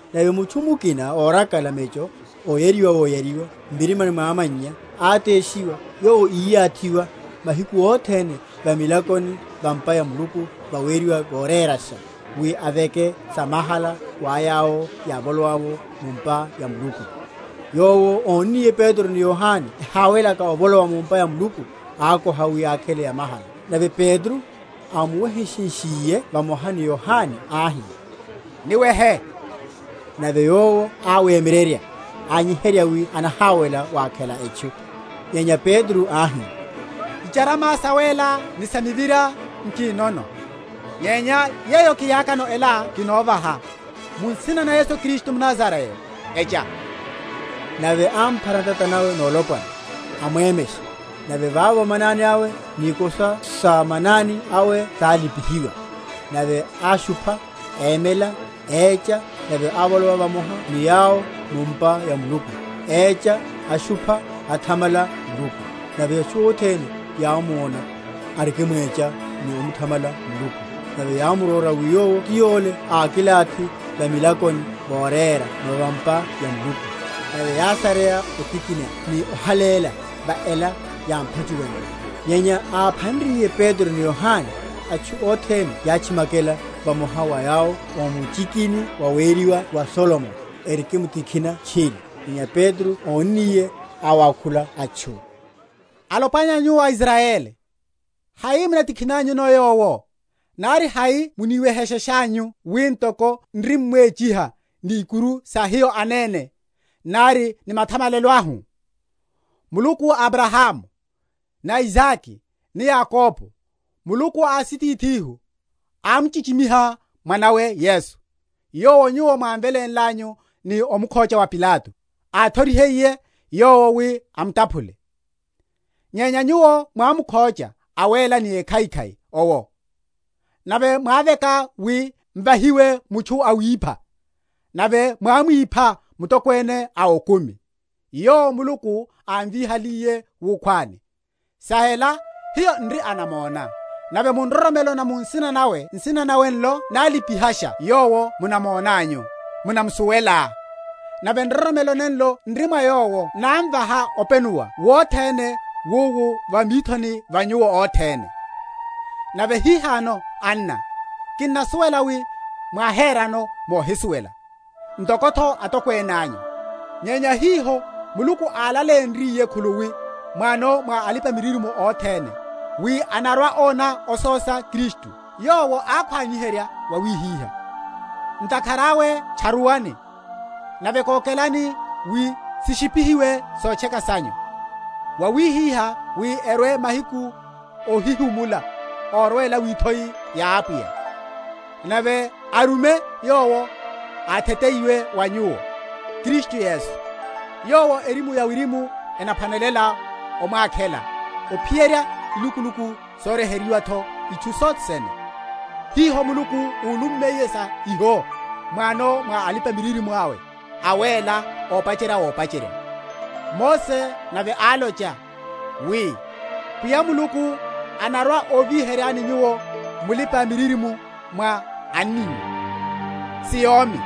Nave mutchu mukina órakala mecho oyariwa woyariwa m’mirimani mwa amannya áteshiwa, yowo íyathiwa mahiku othene va milakoni va’mpa ya Muluku vaweriwa Vorérasha, wi aveke samahala wa yawo yávolowa mu’mpa ya Muluku; yowo, ónniye Petro ni Yohane ehawelaka ovolowa mu’mpa ya Muluku, ákoha wi ákhele yamahala. Nave Petro, ámuweheshenshiye vamoha ni Yohane, áhi, Niwehe. Nave yowo áwemyererya, ányiherya wi anaháwela wakhela etchu. Nyenya Petro áhi, Icharama sawéla ni sa mivira nkinono; nyenya yeyo kiriakano ela kinovaha. Mu nsina na Yesu Kristu mNazarayo, Echa. Nave ámphara ntata nawe nolopwana, amwemesha; nave vavo manani awe ni ikosa só manani awe sálipihiwa. Nave áshupha, émela, écha; nave ávolowa vamoha ni yawo mu’mpa ya Muluku, écha, ashupha, athamala Muluku. Nave atchu othene yámona, arikimwecha ni omuthamala Muluku; nave yámurora, wi yowo ti yole ákilathi va milakoni voréra va’mpa ya Muluku: nave yásareya otikhina ni ohaléla va ela yámphachuwenle. Nyenya áphanriye Petro ni Yohane, atchu othene yátchimakela vamoha wa yawo o muchiki waweriwa wa Solomoni, erikimtikhina tchiri. Nyenya Petro ónniye, áwákhula atchu, Alopwana nyu a Israyeli, hai munatikhinanyuno yowo? nari hai munaniwehesheshanyu wi ntoko n’rimmwechiha ni ikuru sa hiyo anene, nari ni mathamalelo ahu? Muluku a Abrahamu, ni Isake, ni Yakobo, Muluku a asitithihu, ámchichimiha Mwana’we Yesu; yowo nyuwo mwámvelénlanyu ni omukhocha wa Pilato, áthorihiye yowo wi amutaphule. Nyenya nyuwo mwámukhocha Awéla ni Ékhaikhai owo, nave mwáveka wi m’vahiwe mutchu awipha, nave mwámwipha Mutokwene a okumi; yowo Muluku ámvíhaliye wukhwani; sa ela hiyo n’ri anamona. Nave mu nroromelo na mu nsina nawe nsina nawe nlo nálipihasha yowo munamonanyu, munamusuwela; nave nroromelo nenlo n’ri mwa Yowo námvaha openuwa wothene wowu va mithoni va nyuwo othene. Nave hihano, anna, kinnasuwela wi mwáherano mohisuwela, ntoko’tho atokwene anyu. Nyenya hiho Muluku álaleyenryiye khuluwi m’wano mwa alipa‐miririmo othene, wi anarwa‐ona ososa Kristu, Yowo ákhwaniherya wawihiha. Ntakhara awe tcharuwani, nave kókelani wi sishipihiwe sotcheka sanyu, wawihiha wi erwe mahiku óhihimula órwela withoi ya Apwiya; nave arume yowo átheteyiwe wa nyuwo, Kristu Yesu; yowo erimu ya wirimu enaphwanelaya omwakhela ophiyerya ilukuluku soryeherya’tho itchu sothe sene, hiho Muluku úlummiye sa iho m’wano mwa alipa‐miririmo awe awéla opacherya wopacherya. Mose nave álocha, wi, Pwiya Muluku anarwa‐óviheryani nyuwo mulipa‐miririmo mwa anninyu, si yómi;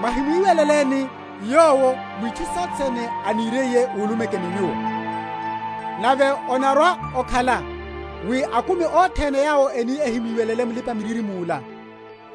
mwahimwíweleléni yowo mwitchu sothe sene aniriye úlumeke ni nyuwo. Nave onarwa‐okhala, wi akumi othene yawo eni ehimwiwelele mulipa‐miririmo yola,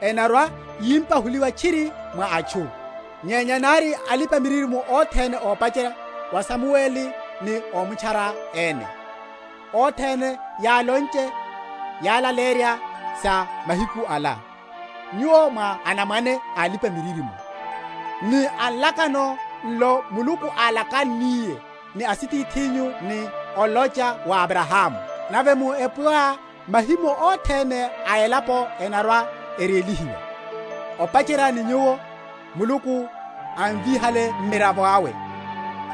enarwa‐yimpahuliwa tchiri mwa atchu. Nyenya nari alipa‐miririmo othene opacherya wa Samueli ni ómutchara ene, othene yálonche, yálaleyerya sa mahiku ala. Nyuwo mwá anamwane a alipa‐miririmo, ni a nlakano nlo Muluku álakanniye ni asitithinyu ni olocha wa Abrahamu, Nave mu epyoá mahimo othene a elapo enarwa‐erélihiwa. Opacherya ni nyuwo, Muluku, ámvíhale Mmiravo awe,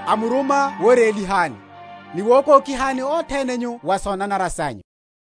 ámuruma worélihani, ni wokókihani othene nyu wa sonanara sanyu.